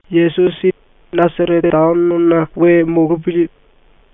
⸤Yesusi Nasarete taonona we molopili⸥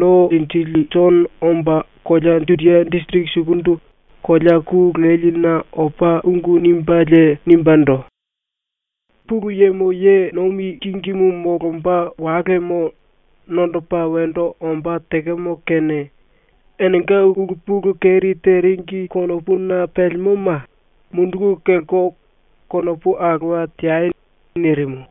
No Linjili Jono omba kolea Judia disiriki sukundu kolea ku leline opa ungu nimbelie nimbendo: “Pulu Yemo ye nomi kingimu molomba walemo nondopa wendo ombá tekemo kene enenga ulu pulu keri teringi konopuna pelemoma munduku kelko konopu alowa teai.” nirimu.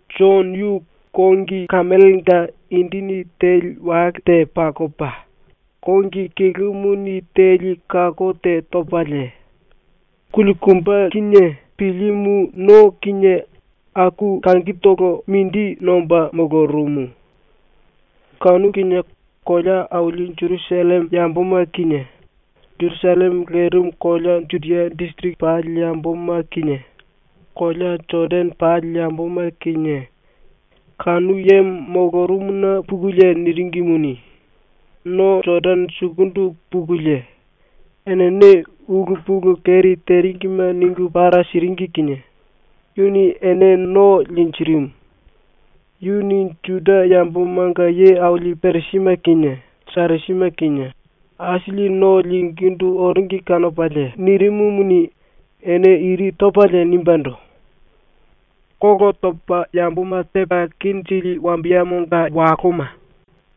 Jono yu kongi kemelenga indini teli wale te pakopa, kongi kilumuni teli kako te topalie, kulikumbe kinie pilimu no kinie aku langitolo mindi nomba molorumu. Kanu kinie kolea aili Jerusalleme yamboma kinie Jerusalleme lerimu kolea Judia disiriki pali yamboma kinie kolea Jodane pali yamboma kinie kanu yemo molorumuna pukulie niringimuni, no Jodane sukundu pukulie enene ulu pulu keri teringime ningu para siringi kinie yuni ene no linjirimu. Yuni ⸤Juda yambomanga ye aili⸥ Parisime kinie Sadusime kinie aisili no lingíndu oringi kanopalie nirimumuni, ene iri topalie nimbendo: “Kolo topa yamboma tepa kenjili wambiyemonga waloma,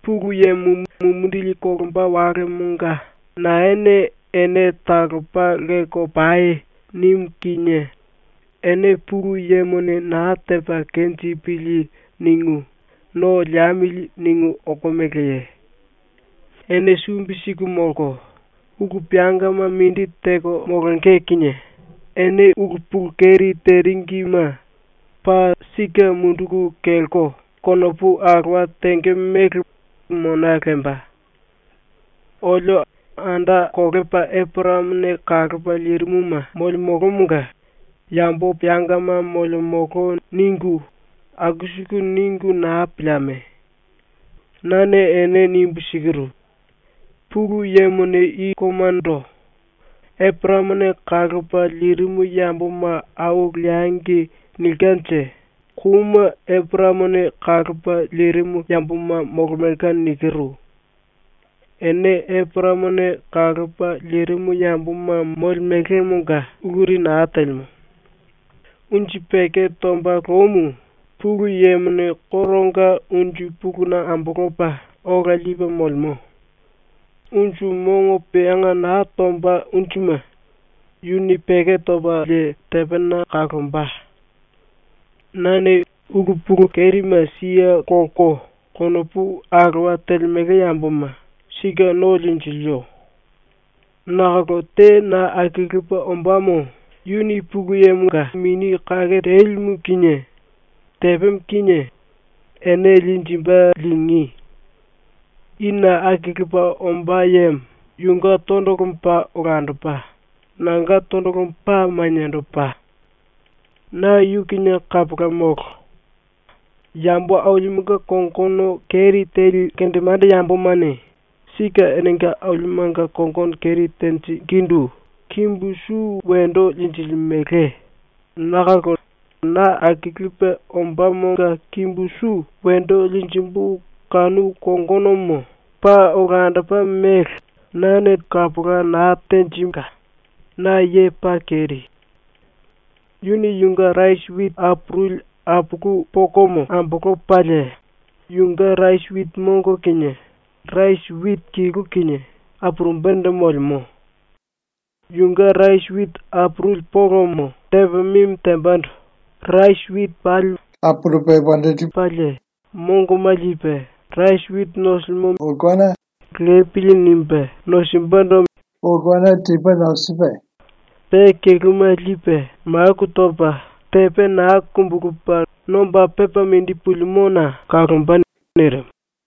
Pulu Yemo mumindili kolomba walemonga naene “Ene talopa lelko pai.” nimu kinie ene ‘Pulu Yemone naa tepa kenjipili.’ ningu ‘No liemili.’ ningu okomeleye? Ene sumbi siku molko, ulu peangama mindi teko molonge kinie ene ulu pulu keri teringime paa sike munduku kelko konopu alowa tenge mele mona lemba. “Olio anda kolepa Eporayamone kalopa lirimuma molemolomonga yambo peangama molemolo.” ningu aku siku ningu naa pilieme. Nane ene nimbu sikiru: ‘Pulu Yemone i koumando “Eporayamone kalopa lirimu yamboma au leangi.” nilkenje kouma Eporayamone kalopa lirimu yamboma molemelka.’ nikiru. Ene Eporayamone kalopa lirimu yamboma molemelemonga uluri naa telemo. “Unju peko tomba loumu Pulu Yemone koronga unju puluna ambolopa ola lipe molemo. Unju mongo peanga naa tomba unjuma yuni peko topalie tepena kalomba. Nane ulu pulu kerime siye kolko konopu alowa telemele yamboma sike no linjilio. Nakolo te na akilipe ombámo yuni ⸤Pulu Yemonga⸥ Mini Kake Telimu kinie tepemo kinie ene linjimbe ⸤lingí⸥. I na akilipe ombá yemo yunge tondolomo paa olandopa, nanga tondolomo paa maniendopa. Na yu kinie manda molo. Yambo ailimenga kongono keri teli kendemande yambomane sike enenga ailimenga kongono keri tenjingindu kimbu su wendo linjilimele nakolo na akilipe ombámonga kimbu su wendo linjimbu kanu kongonomo paa olandopa mele nane tenjimbu kapola naa telka, ⸤na ye paa keri⸥. “Yuni yunge rasi witi apuruli apulu pokomo ambolopalie yunge rasi witi mongo kinie rasi witi kilu kinie apurumbendo molemo. Yunge rasi witi apuruli polomo tepa mimi tembando rasi witi pali ‘wendo liembo.’ nimbe apurupelie mongoma lipe rasi witi nosilimo mingine ‘Lepili.’ nimbe nosimbendo mingi topa, pe kiluma lipe maku topa tepe naa kumbulupe nomba pepa mindi pulimona kalomba.” nirimu.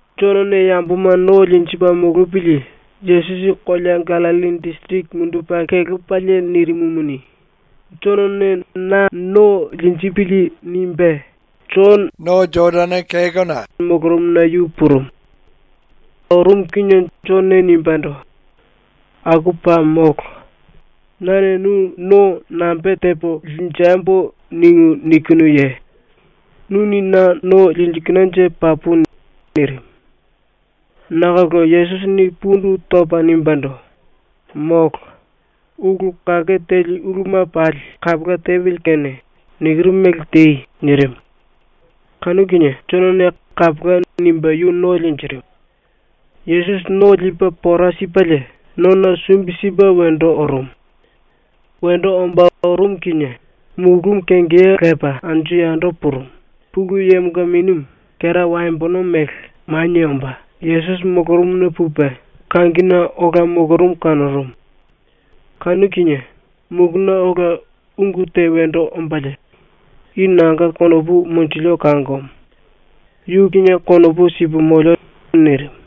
Jonone yamboma no linjipe molopili Yesusi kolea Gallilli disiriki mundupe kelepalie nirimumuni, ‘Jonone na no linjipili.’ nimbe Jono no Jodane molorumuna yu purumu. Orumu kinie Jonone nimbendo: “Aku paa molo. Nane nu no nambe tepo linjembo ningu nikinuye? Nuni na no linjilinanje papu.” nirimu. Nakolo Yesusini pundu topa nimbendo: “Molo. Ulu kake teli uluma pali kapola tepili kene nikiru mele tei.” nirimu. Kanu kinie Jonone “Kapola.” nimbe yu no linjirimu. Yesusi no lipe pora sipelie nona sumbi sipe wendo orumu. Wendo ombá orumu kinie mulúmu kengeya lepa anju yando purumu, Pulu Yemonga Minimu, kera waembono mele, manie omba Yesusi molorumuna pupe kangine ola molorumu kanorumu. Kanu kinie muluna ola ungu te wendo ombalie, “I nanga konopu monjilio kangomo. Yu kinie konopu sipu molio.” nirimu.